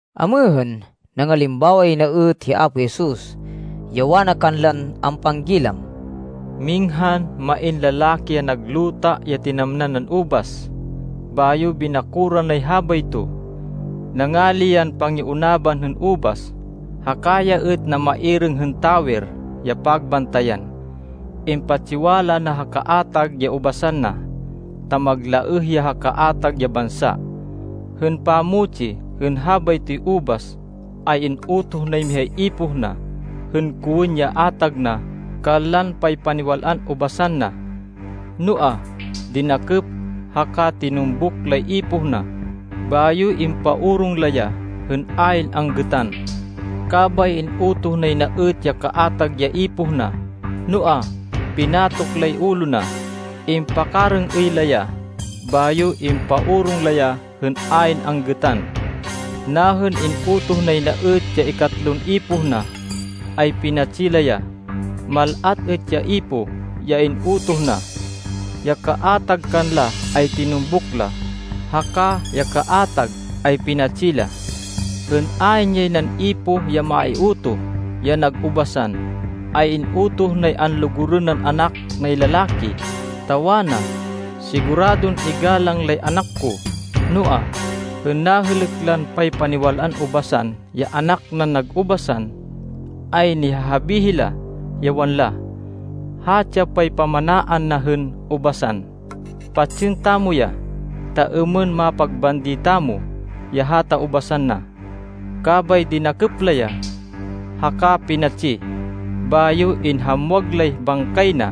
Amêhên, nangalimbawa yay na êt hi Apo Jesus, ya wana kanlan ampanggilam, “Minghan main lalaki ya nag luta ya tinamnan nan ubas. Bayo binakoran nay habayto. Nangali yan pangiunaban hên ubas, haka ya êt namairêng hên tawer ya pagbantayan. Impatsiwala na ha kaatag ya ubasan na, ta maglaêh ya ha kaatag ya bansa. Hên pamutsi hên habaytoy ubas, ay in-utoh nay mihay ipoh na, hên kowên ya atag na kanlan paypaniwal-an ubasan na. Noa, dinakêp haka tinumbuk lay ipoh na, bayo impaorong la ya, hên ayn anggêtan. Kabay in-utoh nay na êt ya kaatag ya ipoh na, noa, pinatok lay ulo na, impakarêng-êy la ya, bayo impaorong la ya hên ayn anggêtan. Nahên in-utoh nay na êt ya ikatlon ipoh na, ay pinatsi la ya. Mal-at êt ya ipoh ya in-utoh na. Ya kaatag kanla ay tinumbuk la, haka ya kaatag, ay pinatsi la. Hên ayn yay nan ipoh ya maiutoh, ya nag ubasan, ay in-utoh nay anlugurên nan anak nay lalaki, ta wana, ‘Siguradon igalang lay anak ko.’ Noa, hên nahêlêk lan paypaniwal-an ubasan ya anak nan nag ubasan, ay nihahabi hila, ya wanla, ‘Hatsi ya paypamanaan na hên ubasan. Patsên tamo ya, ta êmên mapagbandi tamo ya hata ubasan na.’ Kabay dinakêp la ya, haka pinatsi, bayo inhamwag lay bangkay na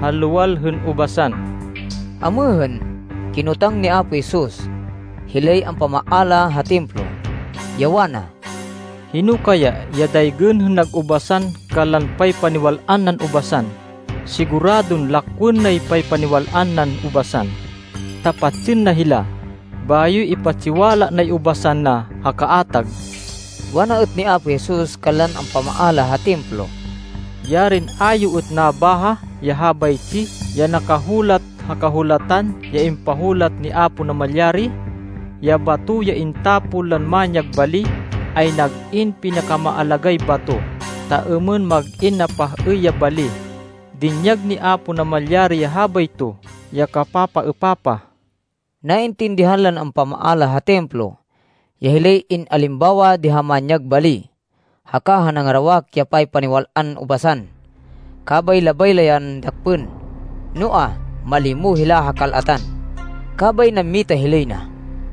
ha luwal hên ubasan.” Amêhên, kinotang ni Apo Jesus, hilay ampamaala ha Templo, ya wana, “Hino kaya ya daygên hên nag ubasan kanlan paypaniwal-an nan ubasan? Siguradon lakwên nay paypaniwal-an nan ubasan, ta patsên na hila, bayo ipatsiwala nay ubasan na ha kaatag.” Wana êt ni Apo Jesus kanlan ampamaala ha Templo, “Yarin a yo êt nabaha ya habaytsi ya nakahulat ha Kahulatan ya impahulat ni Apo Namalyari? ‘Ya bato ya intapon lan manyag bali, ay nag-in pinakamaalagáy bato ta êmên mag-in napah-êy ya bali. Dinyag ni Apo Namalyari ya habayto ya kapapaêpapah.’” Naintindihan lan ampamaala ha Templo, ya hilay in-alimbawa di ha manyag bali, haka ha nangarawak ya paypaniwal-an ubasan, kabay labay la yan dakpên, noa, malimo hila ha kal-atan. Kabay nammita hilay na.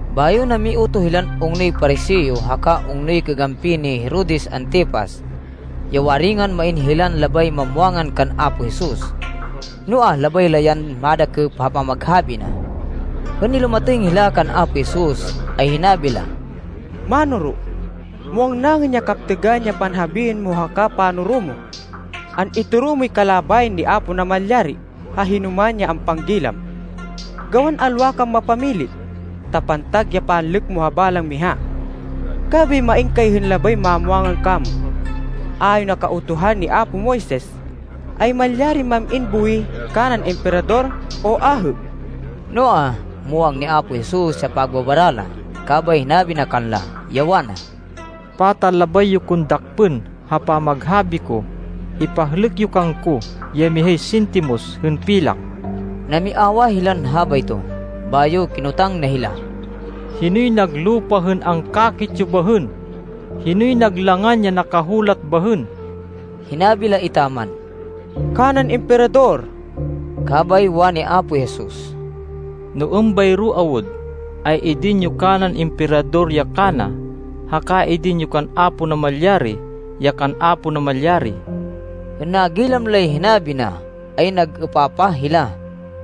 Bayo namiutoh hilan ungnoy Pariseo haka ungnoy kagampi ni Herodes Antipas, ya waringan main hilan labay mamwangan kan Apo Jesus. Noa, labay la yan madakêp ha pamaghabi na. Hên nilumatêng hila kan Apo Jesus, ay hinabi la, “Mánoro, muwang naên ya kaptêgan ya panhabiên mo haka panoro mo. An-itoro moy kalabayan ni Apo Namalyari, ha hinoman ya ampanggilam, gawan alwa kan mapamili, ta pantag ya panlêk mo ha balang miha. Kabay main kay hên labay mamwangan kamo. Ayon ha Kautuhan ni apo Moises, ay malyarin mam-in buwih kanan Emperador o ahê?” Noa, muwang ni Apo Jesus ya pagbabara la, kabay hinabi na kanla, ya wana, “Pata labay yo kon dakpên ha pamaghabi ko! Ipahlêk yo kangko ya mihay sintimos hên pilak.” Namiawah hilan habayto, bayo kinotang na hila. “Hinoy nag lupa hên angkakit yo bahên? Hinoy nag langan ya nakahulat bahên?” Hinabi la etaman, “Kanan Emperador.” Kabay wani Apo Jesus, “No êmbayro awud, ay idin yo kanan Emperador ya kana, haka idin yo kan Apo Namalyari ya kan Apo Namalyari.” Hên nagilam lay hinabi na, ay nag-êpapah hila.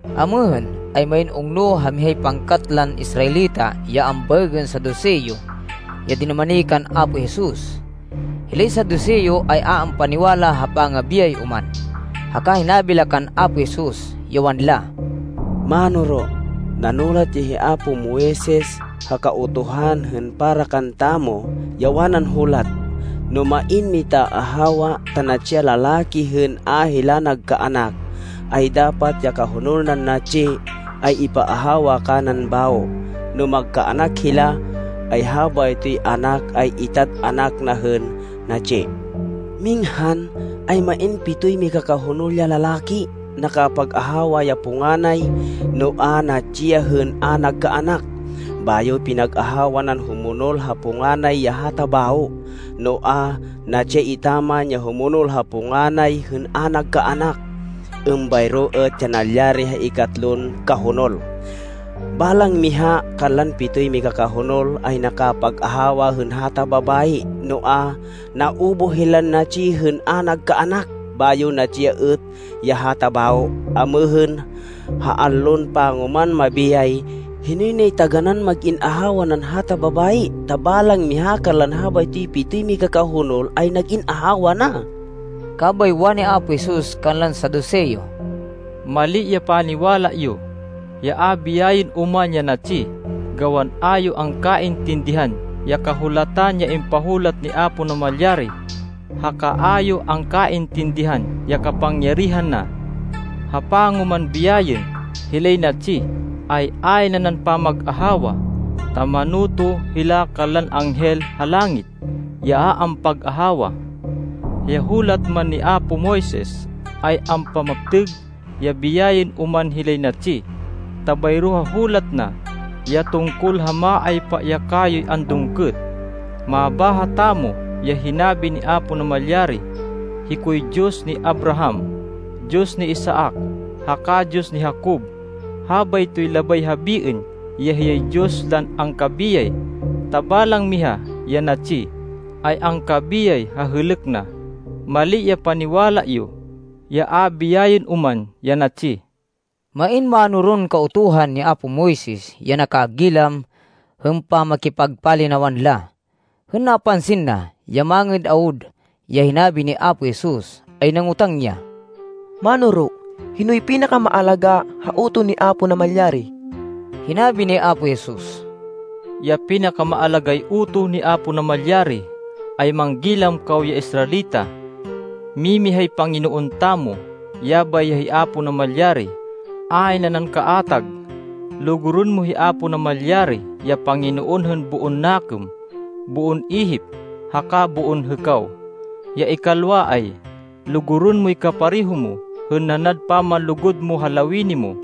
Amêhên, ay main ungno ha mihay pangkat lan Israelita ya ambaêgên Saduseo ya dinumani kan Apo Jesus. Hilay Saduseo ay a ampaniwala ha pangabiyay oman. Haka hinabi la kan Apo Jesus, ya wanla, “Mánoro, nanulat ya hi apo Moises ha Kautuhan hên para kantamo, ya wanan hulat, ‘No main mitaahawa, ta natsi ya lalaki hên a hila nagkaanak, ay dapat ya kahonol nan natsi, ay ipaahawa kanan bawo. No magkaanak hila, ay habaytoy anak, ay itad anak na hên natsi.’ Minghan, ay main pitoy mikakahonol ya lalaki. Nakapag-ahawa ya punganay, noa, natsi ya hên a nagkaanak. Bayo pinag-ahawa nan humonol ha punganay ya hata bawo, noa, natsi ya etaman ya humonol ha punganay hên a nagkaanak. Êmbayro êt ya nalyari ha ikatlon kahonol. Balang miha kanlan pitoy mikakahonol ay nakapag-ahawa hên hata babayi, noa, naubuh hilan natsi hên a nagkaanak. Bayo natsi ya êt ya hata bawo. Amêhên, ha allon pangoman mabiyay, hinoy nay taganán mag-in ahawa nan hata babayi, ta balang miha kanlan habaytoy pitoy mikakahonol ay nag-in ahawa na?” Kabay wani Apo Jesus kanlan Saduseo, “Mali ya paniwala yo, ya a biyayên oman ya natsi, gawan a yo angkaintindihan ya Kahulatan ya impahulat ni Apo Namalyari haka a yo angkaintindihan ya kapangyarihan na! Ha pangoman biyayên hilay natsi, ay ayn nanan pamag-ahawa, ta manoto hila kanlan anghel ha langit ya a ampag-ahawa. Ya hulat man ni apo Moises ay ampamaptêg ya biyayên oman hilay natsi, ta bayro ha hulat na, ya tungkol ha maaypa ya kayoy andungkêt, mabáha tamo ya hinabi ni Apo Namalyari, ‘Hikoy Diyos ni Abraham, Diyos ni Isaac, haka Diyos ni Jacob.’ Habaytoy labay habiên ya hiyay Diyos lan angkabiyay, ta balang miha ya natsi, ay angkabiyay ha hêlêk na. Mali ya paniwala yo, ya a biyayên oman ya natsi.” Main mánoron Kautuhan ni apo Moises ya nakagilam hên pamakipagpalinawan la. Hên napansin na, ya mangêd awud, ya hinabi ni Apo Jesus, ay nangotang ya, “Mánoro, hinoy pinakamaalagá ha utoh ni Apo Namalyari?” Hinabi ni Apo Jesus, “Ya pinakamaalagáy utoh ni Apo Namalyari, ay ‘Manggilam kaw ya Israelita. Mimihay Panginoon tamo, yabay ya hi Apo Namalyari, ayn nanan kaatag. Lugurên mo hi Apo Namalyari, ya Panginoon hên boon nakêm, boon ihip, haka boon hêkaw.’ Ya ikalwa ay, ‘Lugurên moy kapareho mo hên nanad pamanlugud mo ha lawini mo.’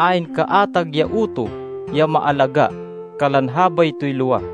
Ayn kaatag ya utoh ya maalagá kanlan habaytoy lowa.”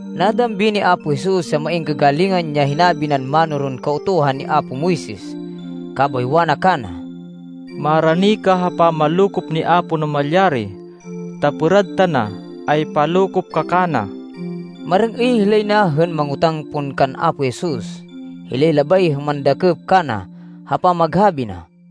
Nadambi ni Apo Jesus ya main kagalingan ya hinabi nan mánoron Kautuhan ni apo Moises, kabay wana kana, “Marani ka ha pamanlokop ni Apo Namalyari, ta pêrad tana ay palokop ka kana.” Marêng-êy hilay na hên mangotáng pon kan Apo Jesus, hilay labay hên mandakêp kana ha pamaghabi na.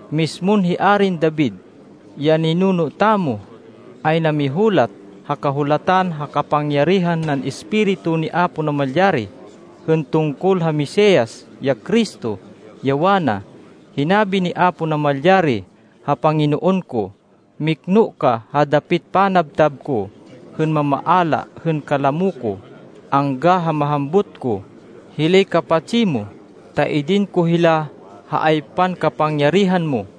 Mismon hi Arin David, ya ninuno tamo, ay namihulat ha Kahulatan ha kapangyarihan nan Espiritu ni Apo Namalyari, hên tungkol ha Mesias, ya Cristo, ya wana, ‘Hinabi ni Apo Namalyari ha Panginoon ko, “Mikno ka ha dapit panabtab ko hên mamaala hên kalamo ko, angga ha mahambut ko hilay kapatsi mo, ta idin ko hila ha aypan kapangyarihan mo.”’”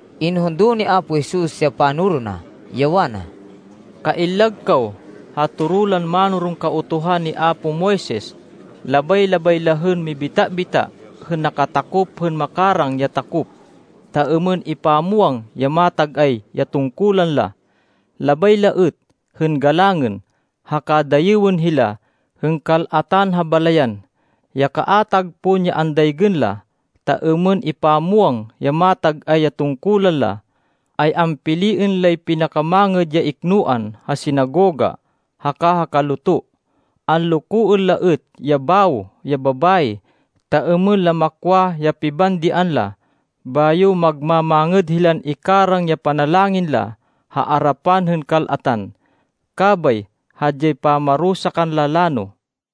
Inhundo ni Apo Jesus ya panoro na, ya wana, “Kaillag kaw ha toro lan mánoron Kautuhan ni apo Moises. Labay-labay la hên mibita-bita hên nakatakop hên makarang ya takop, ta êmên ipamwang ya matag-ay ya tungkulan la. Labay la êt hên galangên, haka dayêwên hila hên kal-atan ha balayan. Ya kaatag pon ya andaygên la ta êmên ipamwang ya matag-ay ya tungkulan la, ay ampiliên lay pinakamangêd ya iknoan ha sinagoga haka ha kaluto. Anlokoên la êt ya bawo ya babayi, ta êmên la makwa ya pibandian la, bayo magma-mangêd hilan ikarang ya panalangin la ha arapan hên kal-atan. Kabay hadyay pamarusa kanla lano.”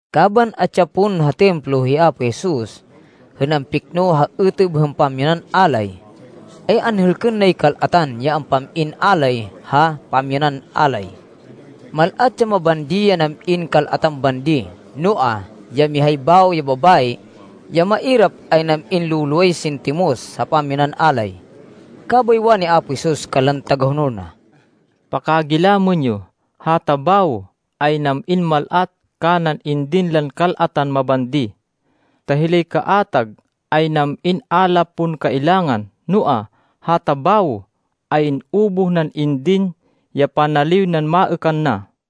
Kaban atsi ya pon ha Templo hi Apo Jesus, hên ampikno ha êtêb hên pamyanan alay, ay anhêlkên nay kal-atan ya ampam-in alay la ha pamyanan alay. Mal-at ya mabandi ya nam-in kal-atan bandi. Noa, ya mihay bawo ya babayi, ya mairap, ay nam-in lo-loway sintimos ha pamyanan alay. Kabay wani Apo Jesus kanlan tagahonol na, “Pakagilamên yo, hata bawo ay nam-in mal-at kanan indin lan kal-atan mabandi. Ta hilay kaatag ay nam-in a la pon kailangan, noa, hata bawo, ay in-ubuh nan indin ya panaliw nan maêkan na.”